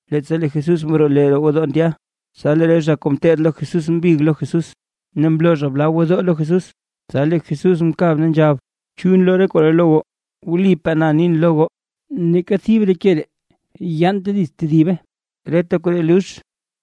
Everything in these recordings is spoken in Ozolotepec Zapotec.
Leettsa lee Jesús mroo lee roo gwodoo ndya, tsa lee re zha kuu ngeteed lo Jesús mbig lo Jesús, ne mloo zha re bla gwodoo lo Jesús. Tsa lee Jesús mkab ne nzhab: ―¿Chu nloo re koree lo goo? ¡Wlipaa na nin lo goo, neeka thib re ke ree yaante dits tedibe, reta koree lux!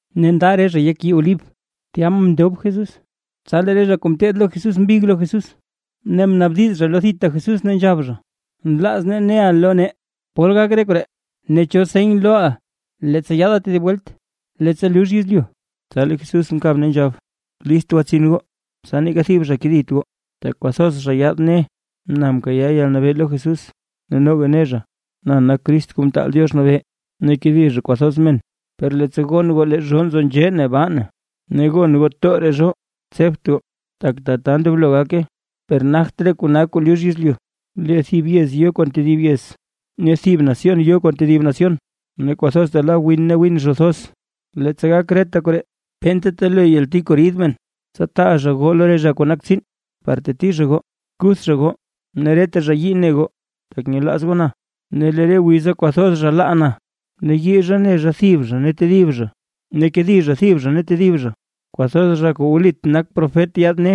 Ne nda re zha yek yii Olib, tya mndob Jesús, tsa lee re zha kuu ngeteed lo Jesús mbig lo Jesús, ne mnaabdiz zha lo thita Jesús ne nzhab zha: ―Nlaaz nee neʼa lo nee, ¿pol gak re koree ne cho seny loo leettsa yaada tedib welt, leettsa lux yezlyu? Tsa lee Jesús mkab ne nzhab: ―List gwatsin goo, tsa neeka thib zha kedit goo, tak kwathoz zha yaad ne: “Na mkayaa yalnabee lo Jesús”. Ne noga ne zha: “Na nak Crist Kuu Mtaal Diox Nabee”, ne kedi zha kwathoz men. Per leettsa gon goo lee zhoo nzo nzhee ne baa na, ne gon goo tooraa zhoo, tsebt goo, tak tata ndoblo gake; per nagt re kona kuu lux yezlyu. Lee thib yez yo kon tedib yez, ne thib nación yo kon tedib nación, ne kwathoz ta la win ne gwin zho thoz. Leettsa gak reta koree, penta telo yalti kuu rid men. ’Tsa taa zha goo lo re zha kuu nak tsiin, par teti zha goo, kuth zha goo ne reta zha yii ne goo, tak nyelaaz goo na. Ne lee re wiza kwathoz zha laa na, ne yii zha ne zha thib zha ne tedib zha, ne kedi zha thib zha ne tedib zha. Kwathoz zha kuu wlit nak profet yaad ne: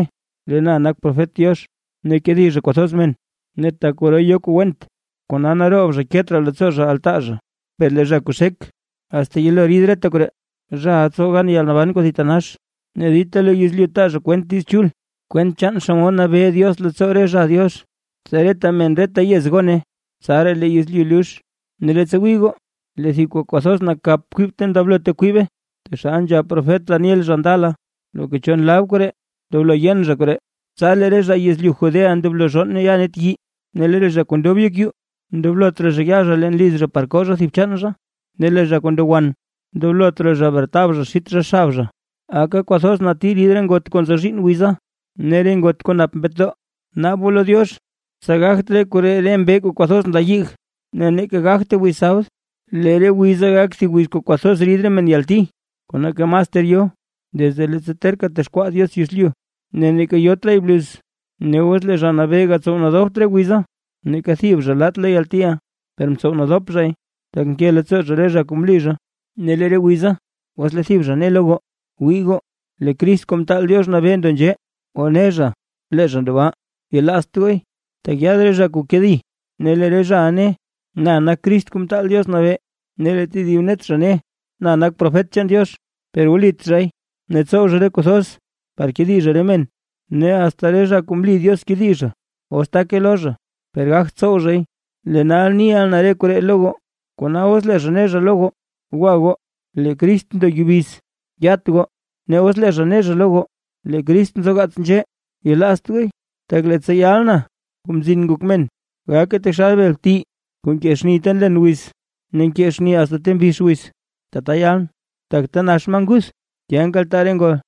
“Lee na nak profet Diox”, ne kedi zha kwathoz men. Ne tak kwaro yo kuu went, kona naroob zha ket raa leettsoo zha altaa zha. Per lee zha kuu xek, asta yelo rid reta koree, zhaʼa tsow gan yalnaban kuu thitanax. Ne dita lo yezlyu taa zha kwent Diiz Chul, kwent chaan xomod Nabee Diox leettsoo re zha Diox, tsa reta men reta yez gone; tsaraa lee yezlyu lux. ’Ne leettsa wii goo lee thib kuu kwathoz nakap kwib ta ndoblote kwibe, taxal nzhab profet Daniel zha ndala. (Loka cho nlab koree ndoblo zha yen koree.) Tsa lee re zha yezlyu Judea ndoblo zhonn ne ya net yii. Ne lee zha kuu ndob yek yuu, ndoblot raa zha ya zha leen liz zha par koo zha thib chaan zha. Ne lee zha kuu ndo wan ndoblot raa bretab zha xit zha xab zha. Aka kwathoz nati rid re ngot kuu nzo zhiinn wiza, ne re ngot kuu nap mbetdoo. Naab goo lo Diox, tsa gagt re koree re mbee kuu kwathoz nla yig, ne neeka gagte wiz sabd. Lee re wiza gak thib wiz kuu kwathoz rid re men yalti, kuu neeka mas ter yo desde leettsa terka texkwaa Diox yezlyu, ne neeka yot raay bluz. Ne os lee Zha Nabee gatsow nadopt re wiza, neeka thib zha laat lo yaltiʼa. Per mtsow nadop zhay, tak nke leettsoo zha re zha kuu mli zha. ’Ne lee re wiza, os lee thib zha ne lo goo: “Wii goo, lee Crist Kuu Mtaal Diox Nabee ndo nzhee, o ne zha lee zha ndo baa”, yelaazt gooy, tak yaad re zha kuu kedi. Ne lee re zhaʼa ne: “Na nak Crist Kuu Mtaal Diox Nabee”, ne lee tedib net zha ne: “Na nak profet chaan Diox”, per wlit zhay. Ne tsow zha re kuu thoz par kedi zha re men, ne asta re zha kuu mli Diox kedi zha, os take lo zha, per gagt tsow zhay. Lee nal niʼa na re koree lo goo. Kona os lee zha ne zha lo goo: “Gwa goo. Lee Crist ndo yubiz”, yat goo, ne os lee zha ne zha lo goo: “Lee Crist nzogaats nzhee”, yelaazt gooy. Tak leettsa yal na, Kuu Mzin Ngok Men, gake taxal bel bti kuu nkee xni ta nlen wiz ne nkee xni asta ta mbix wiz, tata yalʼn. Tak ta nax maa nguth, tya nkaltaa re ngol.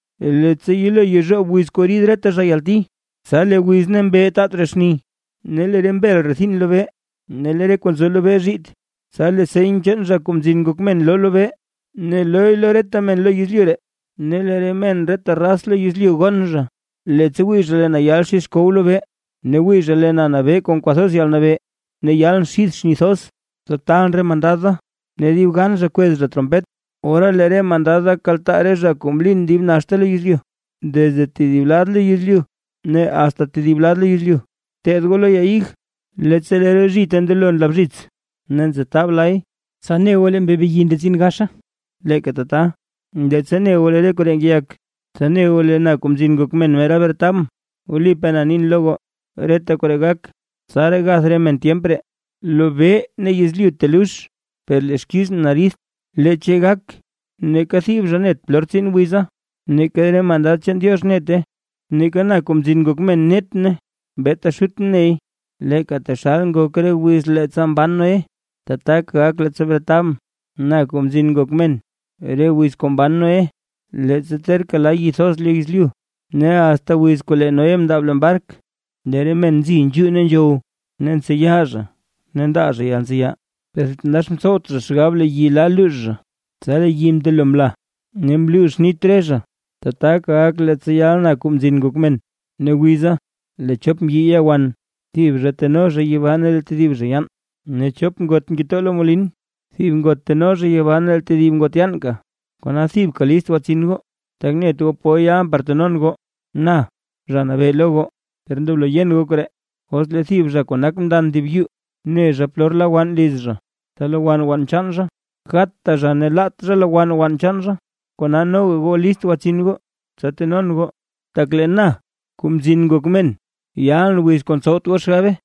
’Leettsa yelo yezhoob wiz kuu rid reta zha yalti, tsa lee wiz ne mbee taat raa xni, ne lee re mbel rethin lobee ne lee re kuu nzo lobee zhiit. Tsa lee seny chaan Zha Kuu Mzin Ngok Men loo lobee ne looy lo reta men lo yezlyu ree. Ne re men reta raz lo yezlyu gonn zha, leettsa wii zha lee na yal xid xkow lobee. Ne wii zha lee na nabee kon kwathoz yalnabee ne yalʼn xid xni thoz. Tsa taalʼn re mandad da, ne dib gan zha kwez zha trompet, ora lee re mandad da kaltaa re zha kuu mlin dib naxta lo yezlyu, desde thib lad lo yezlyu ne asta tedib lad lo yezlyu. ’Bteed goo lo ya ig. Leettsa lee re zhite ndelo nla bzhits, ne ntsetab lay, tsa ne goo lee mbee beyi ndetsin gaxa. Leeka tata, leettsa ne goo lee re koree ngeyak, tsa ne goo lee na, Kuu Mzin Ngok Men, mera bretabʼn. Wlipaa na nin lo goo, reta koree gak. Tsaraa gath re men tyemp ree. Lobee ne yezlyu telux, per lee xkizʼn ridt; leechay gake. ’Neeka thib zha net polor tsin wiza, neeka re mandad chaan Diox nete, neeka na, Kuu Mzin Ngok Men nete. Beeta Xutʼn ney. ’Leeka taxal ngok re wiz leettsa mban Noé, tataka gak leettsa bretab na, Kuu Mzin Ngok Men. Re wiz kuu mban Noé, leettsa terka la yi thoz lo yezlyu ne asta wiz kuu lee Noé mndaab leen bark, lee re men nzi nzhuu ne nzhow ne ntseya ne ndaa zha yalntseya. Per thitanax mtsowt zha xgab lee yi la luux zha, tsa lee yi mndelo mla, ne mluux nit re zha. Tataka gak leettsa yal na, Kuu Mzin Ngok Men. Ne wiza, lee chop mbyi ya wan, thib zha teno zha yibaa ne lee tedib zha yaan. Ne chop ngot ngetoo lo molin; thib ngot teno zha yibaa ne lee tedib ngot yaanka. ’Kona thibka list gwatsin goo, tak net goo pol yalʼn par tenon goo, Na Zha Nabee lo goo. Per ndoblo yen goo koree: Os lee thib zha kuu nak mndan thib yuu, ne zha polor la wann liz zha, tsa lowann wann chaan zha, gatta zha ne laat zha lowann wann chaan zha. Kona noga goo list gwatsin goo tsa tenon goo, tak lee na, Kuu Mzin Ngok Men, yalʼn wiz kuu ntsowt goo xgabe.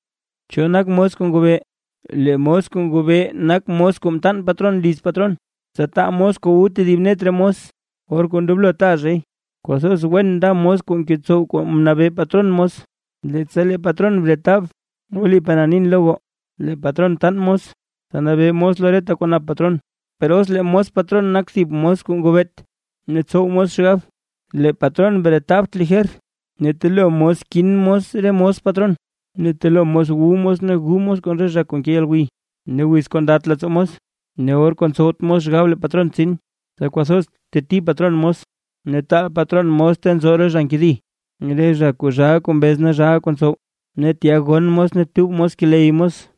’¿Cho nak mos kuu ngobee? Lee mos kuu ngobee nak mos kuu mtaan patron liz patron, tsa taa mos kuu wu tedib net re mos, or kuu ndoblo taa zhay. Kwathoz wen nda mos kuu ngetsow kuu mnabee patron mos, leettsa lee patron bretab. Wlipaa na nin lo goo, lee patron taan mos tsa nabee mos lo reta kwaa nap patron. Per os lee mos patron nak thib mos kuu ngobeet, ne tsow mos xgab: “Lee patron bretabt lijer”, ne telo mos kin mos re mos patron, ne telo mos wu mos ne gu mos kon re zha kuu nke yalgwiy. Ne wiz kuu ndat leettsoo mos, ne or kuu ntsowt mos xgab lee patron tsin. Tsa kwathoz teti patron mos, ne taal patron mos ta nzo re zha nkedi, re zha kuu zhaa kuu mbez ne zhaa kuu ntsow, ne tya gonn mos ne tub mos keley mos.